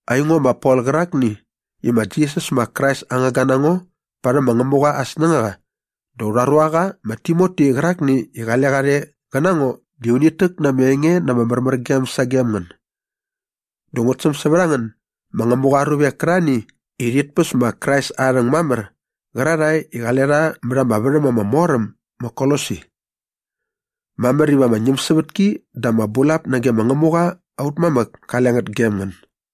Aingo ma Pol qärakni i ma Jisas ma Krais aa ngangga na ngo parhäm ma Ngämuqa aa snängaqa dä aurha ruaqa ma Timoti qärakni i qale qa rhe qä na ngo di unit täk na ama enge na ama märmärgem sagem ngän dä ngut säm sävät a ngän ma Ngämuqa aa ruvek kärarhani i rhit päs ma Krais aa rhäng mamär qärarhae i qale rha mät ama värhäm ama mor äm ma Kolosi. Mamär iva ama ñämsävätki dä ama bulap nage ma Ngämuqa aut mamäk kale ngät gem ngän.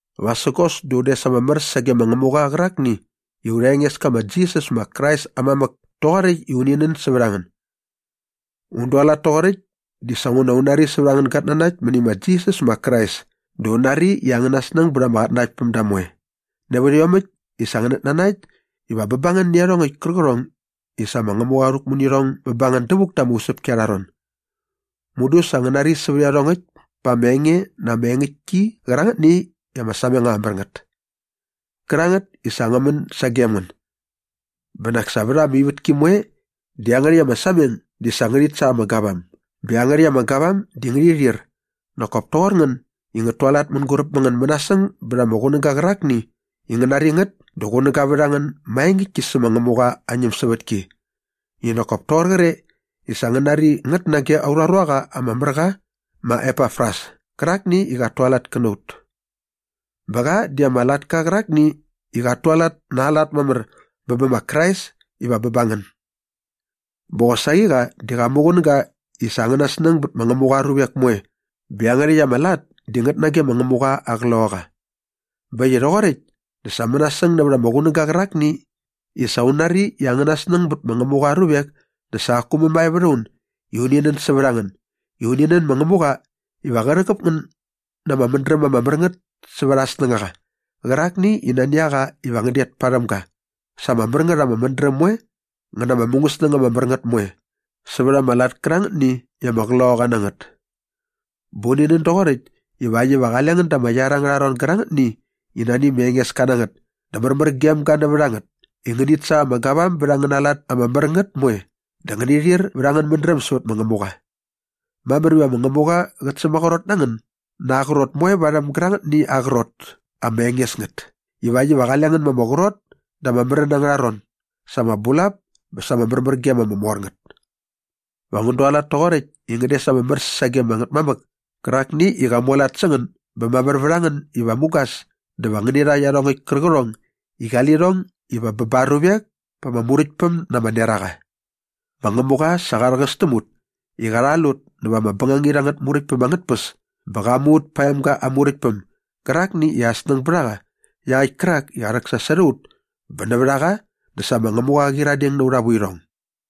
Vasägos dä un des ama mär sage ma Ngämuqa qärakni i aurha Engeska ma Jisas ma Krais aa mamäk toqoräkt i uni nän sävät a ngän. Un dualat toqoräkt dinguna sa un nari sävät angän gatnanakt mäni ma Jisas ma Krais dä un nari i angäna snäng bät ama qatnanaktpämda moe nävät iomäkt i sa ngänät nanakt iva bä ba ngän nä iarhongäkt kärqärhong i sa ma Ngämuqa qa rhäkmu nä irhong bä ba ngän dävuk da ama usäpki arha ron. Mudu sa ngän nari sävät iarhongäkt pa ama enge na ama engäktki qärangätni i ama sameng ama mär ngät kärangät i sa ngä män sagem ngän. Bä nak sa vät ama ivätki moe di iangärhäkt ama sameng di sa ngärhit sa ama gavam bä iangärhäkt ama gavam di ngärhi rhir nak kop toqor ngän i ngät tualat mänguräp mä ngän mänasäng bät ama qunäga qärakni i ngän nari ngät dä qunäga vät a ngän maengäktki sä ma Ngämuqa aa ñämsävätki i nak kop toqoräkt kre i sa ngän nari ngät nage aurha ruaqa ama mär qa ma Epafras kärakni i qat tualat kä na ut. Bä qa di ama latka qärakni i qat tualat na aa lat mamär bä bä ma Krais iva bä ba ngän. Bä qosaqi qa di qa muqunäga i sa angäna snäng bät ma Ngämuqa aa ruvek moe bä iangärhäkt ama lat di ngät nage ma Ngämuqa aa Qloqaqa. Bä äkt i rhoqoräkt dä sa mänasäng nävät ama qunäga qärakni i sa un nari i angäna snäng bät ma Ngämuqa aa ruvek dä sa qaku mämae vät a un i uni nän sävät a ngän i uni nän ma Ngämuqa iva qä rhäqäp ngän na ama mädräm ama mär ngät sävät aa snängaqa qärakni i nani a qa iva ngän det parhäm ga sa ama mär ngät ama mädräm moe ngä na ama mungäsnäng ama mär ngät moe sävät ama lat kärangätni i ama qloqaqa na ngät. Bä uni nän doqoräkt ivakt iva qale ngän da ama iar angärha ron gärangätni i nani ma Engeska na ngät dä märmär gem ga nävät a ngät i ngänit sa ama gavam bät angäna lat ama mär ngät moe dä ngäni rhir vät angän mädräm sävät ma Ngämuqa. Mamär iva ma Ngämuqa qät sämaqrot na ngän na aa qrot moe parhäm gärangätni aa qrot ama enges ngät ivakt iva qale ngän ma ama qrot da ama märän angärha ron sa ama bulap bä sa ama märmärgem ama mor ngät. Va ngän dualat toqoräkt i ngän des ama mär sage ama Ngätmamäk kärakni i qa mualat sä ngän bä mamär vät a ngän iva mugas dä va ngäni rha iarhongäkt kärqärhong i qali lirhong iva bä ba aa ruvek pa ama Muräktpäm na ama neraqa. Ma Ngämuqa sa qa rhäqäs täm ut i qa rhal ut näva ama bängangit angät muräktpäm angät tpäs bä qa mu ut pa aa emga aa Muräktpäm gärakni i aa snäng bät a qa iaqäkt kärak i qa rhäksasot a ut bä nävät a qa dä sa ma Ngämuqa qa qyiradeng nä aurha vuirhong.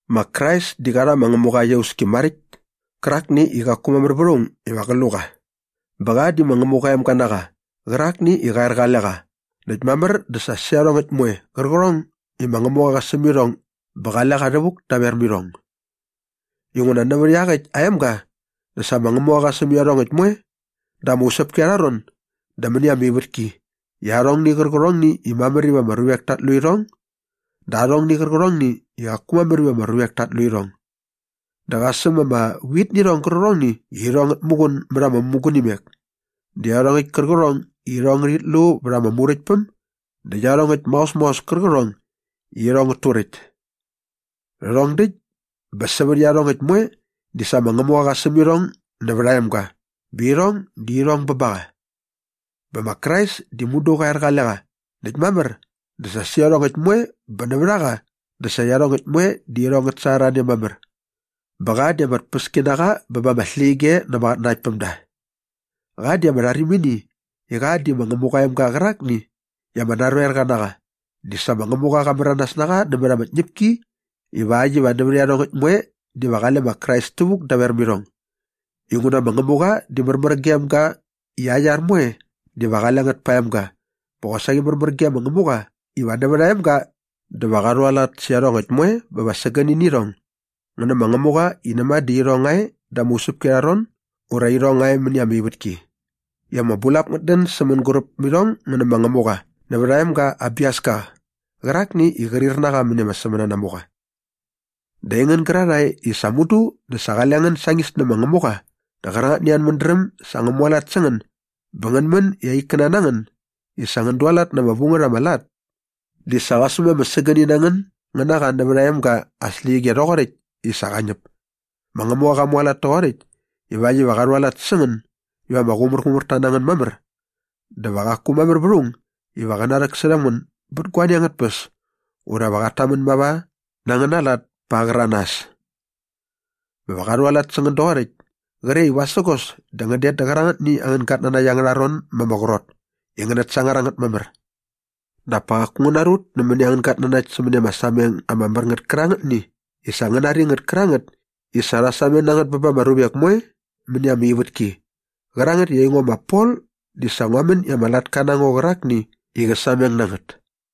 Ma Krais di qa rha ma Ngämuqa aa iauski maräkt kärakni i qaku mamär vät aung iva qä lu qa bä qa di ma Ngämuqa aa emga na qa qärakni i qa er qale qa näkt mamär dä sa sä iarhongäkt moe qärqärhong i ma Ngämuqa sa qa säm irhong bä qale qa rhävuk daver mä irhong. Inguna nävät iaqäkt aa emga dä sa ma Ngämuqa qa säm iarhongäkt moe da ama usäpki arha ron dä mäni ama ivätki i arhongni qärqärhongni i mamär iva ama ruvek tat lu irhong dä arhongni qärqärhongni i qaku mamär iva ama ruvek tat lu irhong. Dä qa säm ama vitnirhong gärqärhongni i irhong ngät muqun mät ama mämugunimek dä iarhongäkt kärqärhong i irhong ngärhit lu vät ama muräktpäm dä iarhongäkt maos maos kärqärhong i irhong ngät turäkt. Rhärhong däkt bä sävät iarhongäkt moe di sa ma Ngämuqa qa säm irhong nävät aa emga bä irhong di irhong bä ba qa. Bä ma Krais di mudu qa er qale qa näkt mamär dä sa sä iarhongäkt moe bä nävät a qa dä sa iarhongäkt moe di irhong ngät sangar a ne mamär. Bä qa di ama tpäski na qa bä ba ama släqyige na ama qatnanaktpämda. Qa di ama rharimini i qa di ma Ngämuqa aa emga qärakni i ama narhoerqa na qa di sa ma Ngämuqa qa märanas na qa nämät ama tñäpki ivakt iva nävät iarhongäkt moe diva qale ma Krais tävuk daver mä irhong. Inguna ma Ngämuqa di märmär gem ga i aa iar moe diva qale ngät pa aa emga bä qosaqi märmär ge ma Ngämuqa iva nävät aa emga dä va qa rhualat sä iarhongäkt moe bä va sägäni nä irhong ngä na ma Ngämuqa i näma dä irhong nga e da ama usäpki arha ron ura irhong nga e mäni ama ivätki i ama bulap ngät dän sä mänguräp mä irhong ngä nä ma Ngämuqa nävät aa emga aa biaska qärakni i qrir na qa mäni ama sämänanamuqa. Näkt aingän gärarhae i sa mudu dä sa qale ngän sañis nä ma Ngämuqa dä qärangätni angän mädräm sa ngä mualat sä ngän bä ngän män i aa ikkäna na ngän i sa ngän dualat na ama vu ngät ama lat di sa qa säm ama sägäni na ngän ngän na qa nävät aa emga aa släqyige rhoqoräkt i sa qa ñäp. Ma Ngämuqa qa mualat toqoräkt ivakt iva qa rhualat sä ngän iva ama qumärqumärta na ngän mamär dä va qaku mamär vät aung iva qä narhäksärhäm ngän bät guani angät tpäs ura va qat tamän mava na angäna lat pa aa qäranas. Bä va qa rhualat sä ngän doqoräkt kre i vasägos dä ngän det dä qärangätni angän gatnanakt angärha ron ma ama qrot i ngänät sangar a ngät mamär. Dap pa qaku ngän narut nämäni angän gatnanakt sämäni ama sameng ama mär ngät kärangätni i sa ngän nari ngät kärangät i sa rha sameng na ngät bä ba ama ruvek moe mäni ama ivätki qärangät i aingo ma Pol di sa ngua män i ama latka na ngo qärakni i qä sameng na ngät.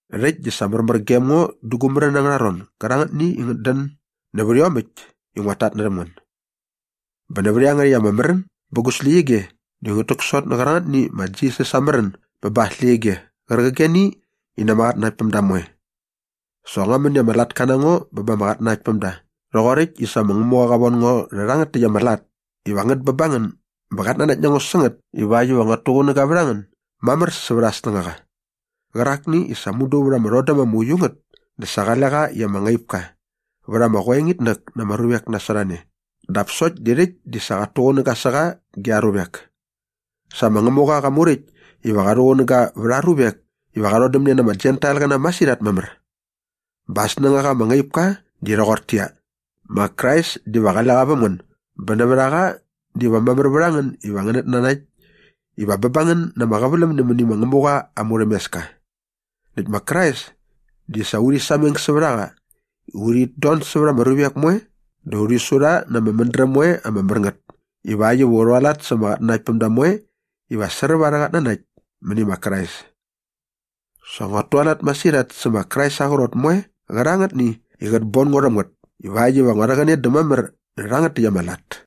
Rhäkt di sa märmär gem ngo da gu märän angärha ron gärangätni i ngät dän nävät iomäkt i nguat tatnärhäm ngän. Bä nävät iangärhäkt ama märän bä gu släqyige di ngut täksot nä qärangätni ma Krais aa märän bä ba aa släqyige qärqigeni i na ama qatnanaktpämda moe. Sa ngua män i ama latka na ngo bä ba ama qatnanaktpämda rhoqoräkt i sa ma Ngämuqa qa von ngo rhärhangät täkt ama lat iva ngät bä ba ngän bä qat nanakt na ngo sä ngät ivakt iva nguat tuqunäga vät a ngän mamär sävät aa snängaqa qärakni i sa mudu vät ama rhodäm ama uiu ngät dä sa qale qa i ama ngaip ka vät ama qoengitnäk na ama ruvek nasot a ne dap sokt di rhäkt di sa qat tuqunäga sä qa ge aa ruvek. Sa ma Ngämuqa qa muräkt iva qa rhuqunäga vät aa ruvek iva qa rhodämne na ama Jentailqäna masirhat mamär. Bä aa snängaqa ama ngaip ka di rhoqortäqyia, ma Krais diva qale qa väm ngän bä nävät a qa diva mamär vät a ngän iva ngänät nanakt iva bä ba ngän na ama qäväläm nämäni ma Ngämuqa aa murhämeska. Näkt ma Krais di sa urhi sameng sävät a qa i urhit don sävät ama ruvek moe dä urhi su rha na ama mädräm moe ama mär ngät ivakt iva u rhualat sa ama qatnanaktpämda moe iva sräp arhä qatnanakt mäni ma Krais. Sa nguat tualat masirhat sä ma Krais aa qrot moe qärangätni i qät bon ngo rhäm ngät ivakt iva ngua rhäqäne dä mamär nä rhangät täkt ama lat.